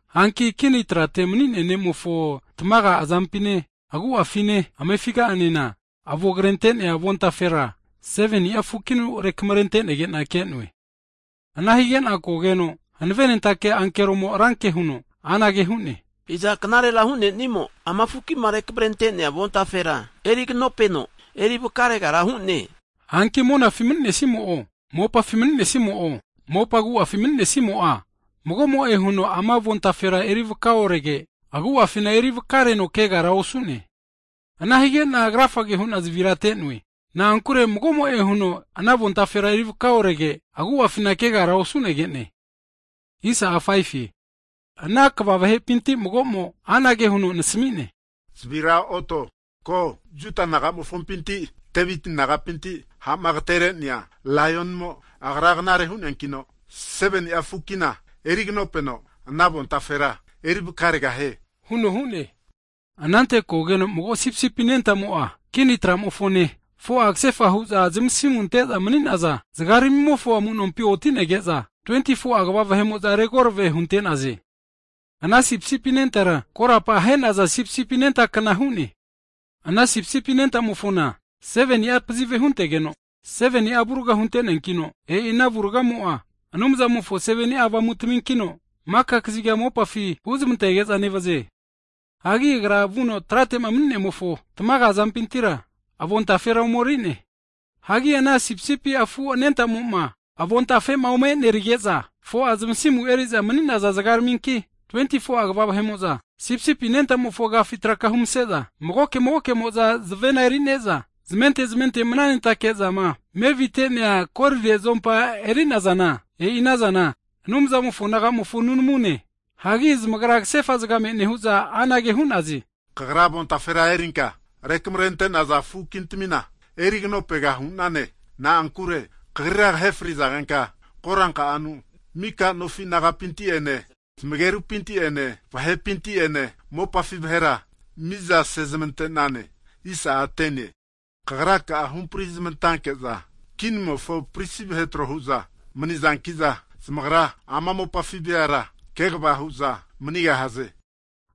Hanki kini trate mani'nea Ne'mofo tmaga azampine agu'afine amefiga'anena, avo krente'nea avontafera, 7ni'a fukinu rekamrentenegena ke'noe. Ana higena kogeno hanavenentake ankeromo ranke huno anage hu'ne, Iza knarera hu'nenimo, ama fukima rekamrentenea avontafera erignopeno erivaka regara hu'ne? Hanki monafi mni'nesimo'o, mopafi mni'nesimo'o, mopa agu'afi mni'nesimo'a, mago'mo'e huno ama ana avontafera erivaka orege, agu'afina erivakareno kegara osu'ne. Ana hige'na krafage hu'na zavira ate'noe, na'ankure mago'mo'e huno ana avontafera eri vaka orege, agu'afina kegara osu'negene. Ana 24'a elda kva vahepinti mago'mo anage huno nasamine, zavira otenka ko! Juda naga'nofipinti Deviti negeho ha'ma agaterenea Laionimo, Agra 7ni'a fukina eriganopega hu'neankino ana avontafera erivakarega hu'ne. Anante kogeno mago sipisipi anentamo'a kini tramofone, 4'a kasefa hu'za zmasimuma ante'za mni'naza zgaramimofo amunompi oti'nege'za, 24'a elda kva vahe'mo'za regorave hunte'naze. Ana sipisipi anentara korapa ahenaza sipisipi anenta kna hu'ne. Ana sipisipi anentamofona 7ni'a pazive huntegeno, 7ni'a avurga hunte'neankino, e'i ana avurgamo'a Anumzamofo 7ni'a avamutaminkino, maka kaziga mopafi huzmantege'za nevaze. Hagi Agra vuno tratema mni'nemofo tamaga azampintira avontafera omeri'ne. Hagi ana sipisipi afu anentamoma avontafe'ma omenerige'za, 4'a zmasimu eri'za mni'naza zgaraminki, 24'a elda kva vahe'mo'za, sipisipi anentamofo agafi zmarenare'za magoke magoke'mo'za zavena (harp) erine'za, zmente zmente mananentake'zama kre sramnavu'za mevite'nea korire zuompa erinazana, e'i anazana Anumzamofo nagamofo nunamune. Hagi zmagra kasefa zgame nehu'za anage hu'naze, Kagra avontafera erinka rekamrente'naza fukintamina eriganopega hu'nane. Na'ankure Kagrira kahe frizagenka koranka'anu, mika nofi nagapinti'ene, zmagerupinti'ene, vahepinti'ene, mopafi vahera mi'za sezmante'nane. Kagraka'a kumaka'afi huhampri zmantanke'za, kinimofo prisi vahe tro huza manizankiza, zamagra ama mopafi veara kegva hu'za manigahaze.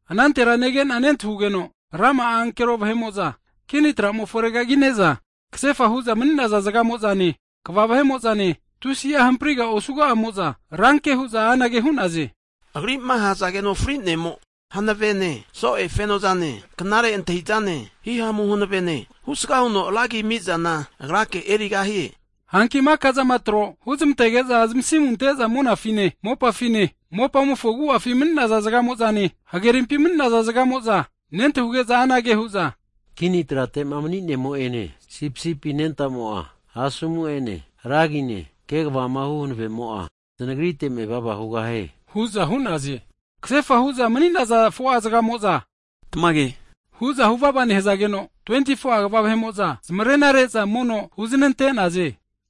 Anantera nege'na nentahugeno, rama'a ankero vahe'mo'za kini tramofona regagine'za, kasefa hu'za mni'naza zgamo'zane, 24'a elda kva vahe'mo'zane, tusi'a hampriga osuga'amo'za, ranke hu'za anage hu'naze, Agri'ma ahazageno fri'nemo, hanavene so'e feno'zane, knare antahizane, himamu hanavene, husga huno ra agia ami'zana Agrake erigahie. Hanki maka'zama tro huzmantege'za zamasimu ante'za monafine, mopafine mopamofo agu'afi mni'naza zgamo'zane, hagerimpi mani'naza zgamo'za, nentahuge'za anage hu'za, Kini trate'ma mani'nemo'ene sipisipi anentamo'a asomu'ene ra agine, kegvamahu hanavemo'a, Znagrite mevava hugahie hu'za hu'naze. Kasefa hu'za mni'naza 4'a zgamo'za tamage hu'za huvava nehazageno, 24'a elda kva vahe'mo'za zmarenare'za mono huznante'naze.